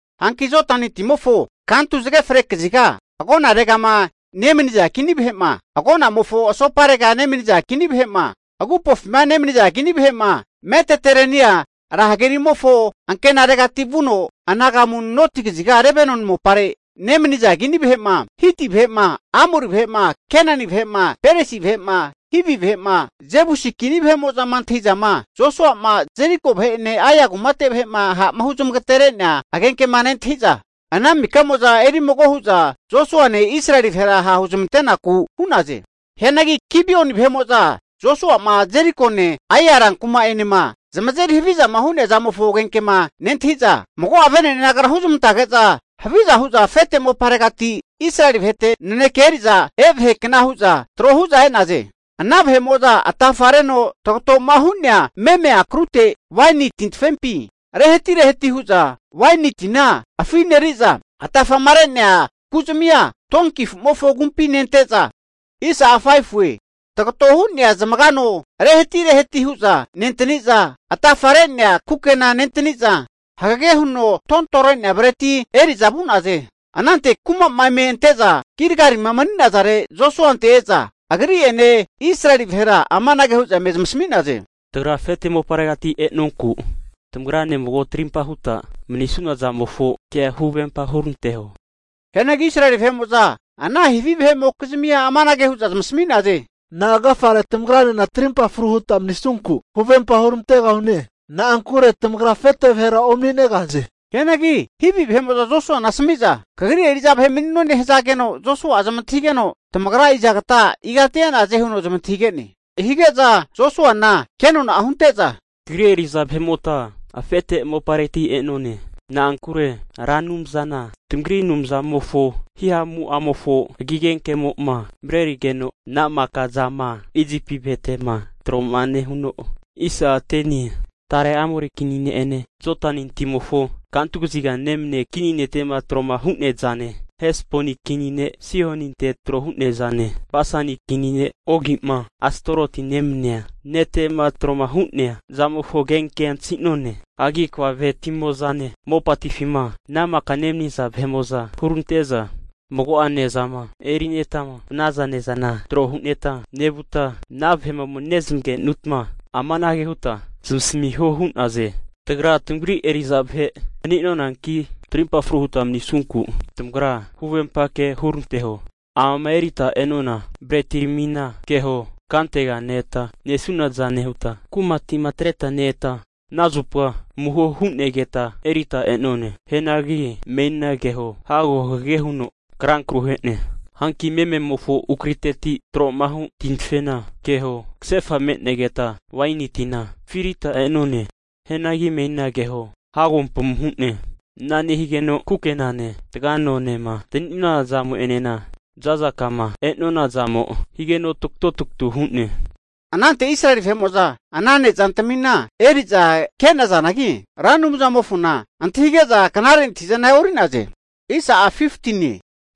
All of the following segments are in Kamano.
Hanki Jodani timofo kantu zage fre kaziga agonaregama nemaniza kini vahe'ma, agonamofo asoparega nemaniza kini vahe'ma, agupofima nemaniza kini vahe'ma, Mediterenia ra hagerimofo ankinaregati vuno anagamu noti kaziga Lebanoni mopare nemaniza kini vahe'ma, Hiti vahe'ma Amori vahe'ma, Kenani vahe'ma, Peresi vahe'ma, Hivi vahe'ma Jebusi kini vahe'mo'zama antahi'zama Josua'ma Jeriko vahe'ene Ai kumate vahe'ma ha'ma huzamagaterea agenkema nentahi'za, ana maka'mo'za eri mago hu'za Josuane Israeli vahera ha' huzmante'naku hu'naze. Hianagi Gibioni vahe'mo'za Josuama Jerikone Ai rankuma'enema zamazeri havizama hu'nea zamofo agenkema nentahi'za, mago'a vene'ne nagara huzmantage'za haviza hu'za afete moparegati Israeli vahete naneke eri'za e' vahekna hu'za e'naze. Ana vahe'mo'za atafareno tagatoma hu'nea meme akrute waini tintafempi rehati rehati hu'za waini tina afineri'za, atafama re'nea kuzamia donki afumofo agumpi nente'za, tagoto hu'nea zamaga ano rehati rehati hu'za nentani'za, atafare'nea kukena nentani'za, hagege huno tontore'nea breti eri'za vu'naze. Anante kuma'ma eme ante'za Gilgalima mani'nazare Josuante e'za, agri'ene Israeli vahera amanage hu'za eme zmasami'naze, tagra afete moparegati e'nonku tamagrane mago tarimpa huta manisuna zamofo kea huvempa huranteho. Hianagi Israeli vahe'mo'za ana Hivi vahe'mokizmia amanage hu'za zamasami'naze, Na'a agafare tamagranena tarimpa fru huta manisunku, huvempa huramantegahune? Na'ankure tamagra afeti vahera omani'negahaze. Hianagi Hivi vahe'mo'za Josuana asami'za, kagri eri'za vahe mani'none hazageno, Josua'a zamantahigeno, tamagra izagata, igati e'naze? Hige'za Josuana kenona'a hunte'za, kagri eri'za vahe'mota afete mopareti e'none. Na'ankure Ra Anumzana tamagri Anumzamofo hihamu'amofo agi agenkemo'ma marerigeno, ana maka zama Isipi vahete'ma tro'ma nehuno, tare Amori kini ne'ene Jodani timofo kantu kaziga nemania kini nete'ma tro'ma hu'nea zane, Hesboni kini ne' Sihoninte tro hu'nea zane, Basani kini ne' Ogi'ma Astoroti nemania nete'ma tro'ma hu'nea zamofo agenkea antahi'none. Hagi kva vaheti'mozane mopatifi'ma ana maka nemaniza vahe'mo'za hurante'za, mago'a ne'zama erinetama vanaza ne'zana tro hu'neta, nevuta ana vahe'ma ome nezamagenutma amanage huta zamasamiho hu'naze, tagra tamagri eri'za vahe mani'nonanki, trimpa fru huta manisunku tamagra huvempa kea huranteho. Amama erita e'nona bretiramina keho, kantega ne-eta nesunazane huta kumati'ma atreta ne-eta ana zupa amuho hu'negeta erita e'none. Hianagi menina keho, hago hagege huno ankra kruhe'ne. Hanki mememofo akruteti tromahu tintafena keho, kasefa me'negeta waini tina afirita e'nonane. Hianagi menina keho, hago ampamu hu'ne. Ana nehigeno kukenane taga anonema antani'nona zamo'enena za'za kama e'nona zamo higeno tagatotagatu hu'ne. Anante Israeli vahe'mo'za ana nezantamina eri'za ke'nazanagi, Ra Anumzamofona antahige'za knare antahi'zana e'ori'naze.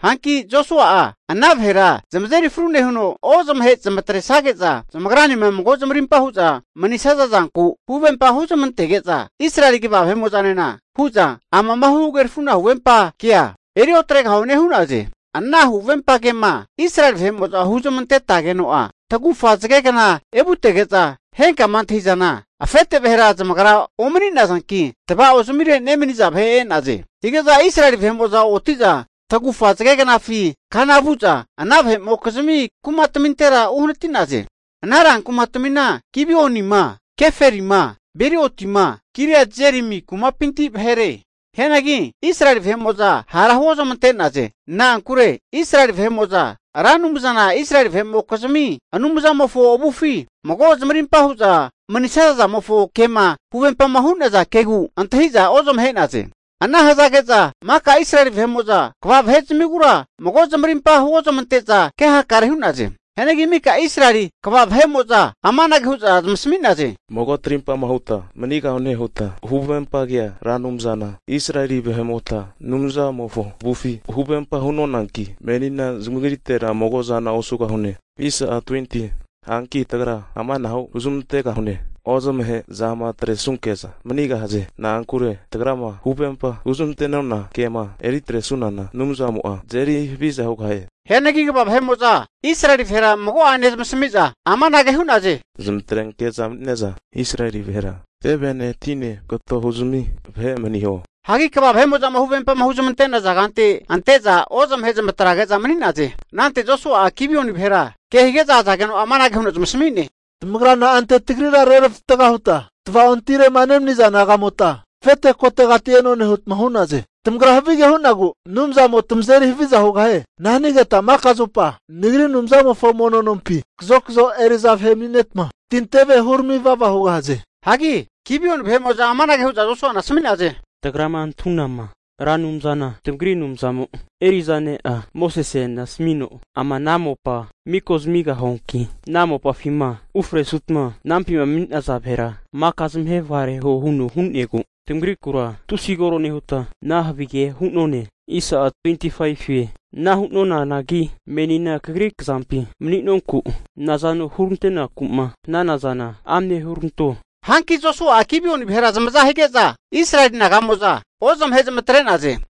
Hanki Josua'a ana vahera zamazeri fru nehuno, ozamahe zamatresage'za zamagranema mago zamarimpa hu'za manisaza zanku huvempa hunezmantege'za, Israeli kva vahe'mo'zanena hu'za amama huhagerafuna huvempa kea eri otregahune hu'naze. Ana huvempa kema Israeli vahe'mo'za huzamantetageno'a tagufa zagegna evutege'za, henkama antahi'zana afeteti vahera zamagra ome'nazanki, tva'ozamire nemaniza vahe e'naze. Hige'za Israeli vahe'mo'za oti'za tagufa zagegnafi kana vu'za ana vahe'mokizmi kumatmintera uhanati'naze. Ana ran kumatmina, Gibionima, Kefirama, Birotima, Kiriati Jearimi kumapinti vahere. Hianagi Israeli vahe'mo'za hara huozamante'naze. Na'ankure Israeli kva vahe'mo'za, Ra Anumzana Israeli vahe'mokizmi Anumzamofo avufi mago zamarimpa hu'za manisaza zamofo kema huvempama hu'naza kegu antahi'za ozamahe'naze. Ana hazage'za maka Israeli vahe'mo'za kva vahe'zamigura mago zamarimpa huozamante'za ke hakare hu'naze. Hianagi mika Israeli kva vahe'mo'za amanage hu'za zamasami'naze, Mago tarimpama huta manigahune huta huvempa kea, Ra Anumzana Israeli vahe'mota Anumzamofo avufi huvempa hu'nonanki menina zamagritera mago'zana osugahune. Hanki tagra amanahu huzmantegahune, ozamahe zamatresunke'za manigahaze. Na'ankure tagrama huvempa huzmante'nona kema eri atresunana Anumzamo'a tazeri haviza hugahie. Hianagi kva vahe'mo'za Israeli vahera mago'ene zamasami'za amanage hu'naze, Zamatrenke'za mani'ne'za Israeli vahera tevene tine kato huzami vahe maniho. Hagi kva vahe'mo'zama huvempama huzmante'naza kante ante'za ozamahe zamatrage'za mani'naze. Anante Josua'a Gibioni vahera kehige'za azageno amanage huno zamasami'ne, tamagra na'ante tagrira reravatga hutma, tvaontirema nemaniza naga'mota, afete kotegati e'none hutma hu'naze? Tamagra havige hu'nagu Anumzamo'a tamazeri haviza hugahie. Ana hanigetma maka zupa nagri Anumzamofo mono nompi kazokzo eri'za vahe mani'neta, tinteve hurami vava hugahaze. Hanki Gibioni vahe'mo'za amanage hu'za Josuana asami'naze, tagrama antahunama Ra Anumzana tamagri Anumzamo eri'za ne'a Mosesena asami'no, ama ana mopa miko zamigahuanki ana mopafima ufresutma anampima mani'naza vahera maka zamahe vagareho huno hu'negu, tamagrikura tusi koro nehuta ana havigea hu'none. Ana hu'nonanagi menina kagri kzampi mani'nonku, nazano hurante'naku'ma hanana zana amne huranto. Hanki Josua'a Gibioni vahera zamaza hige'za, Israeli naga'mo'za ozamahe zamatre'naze.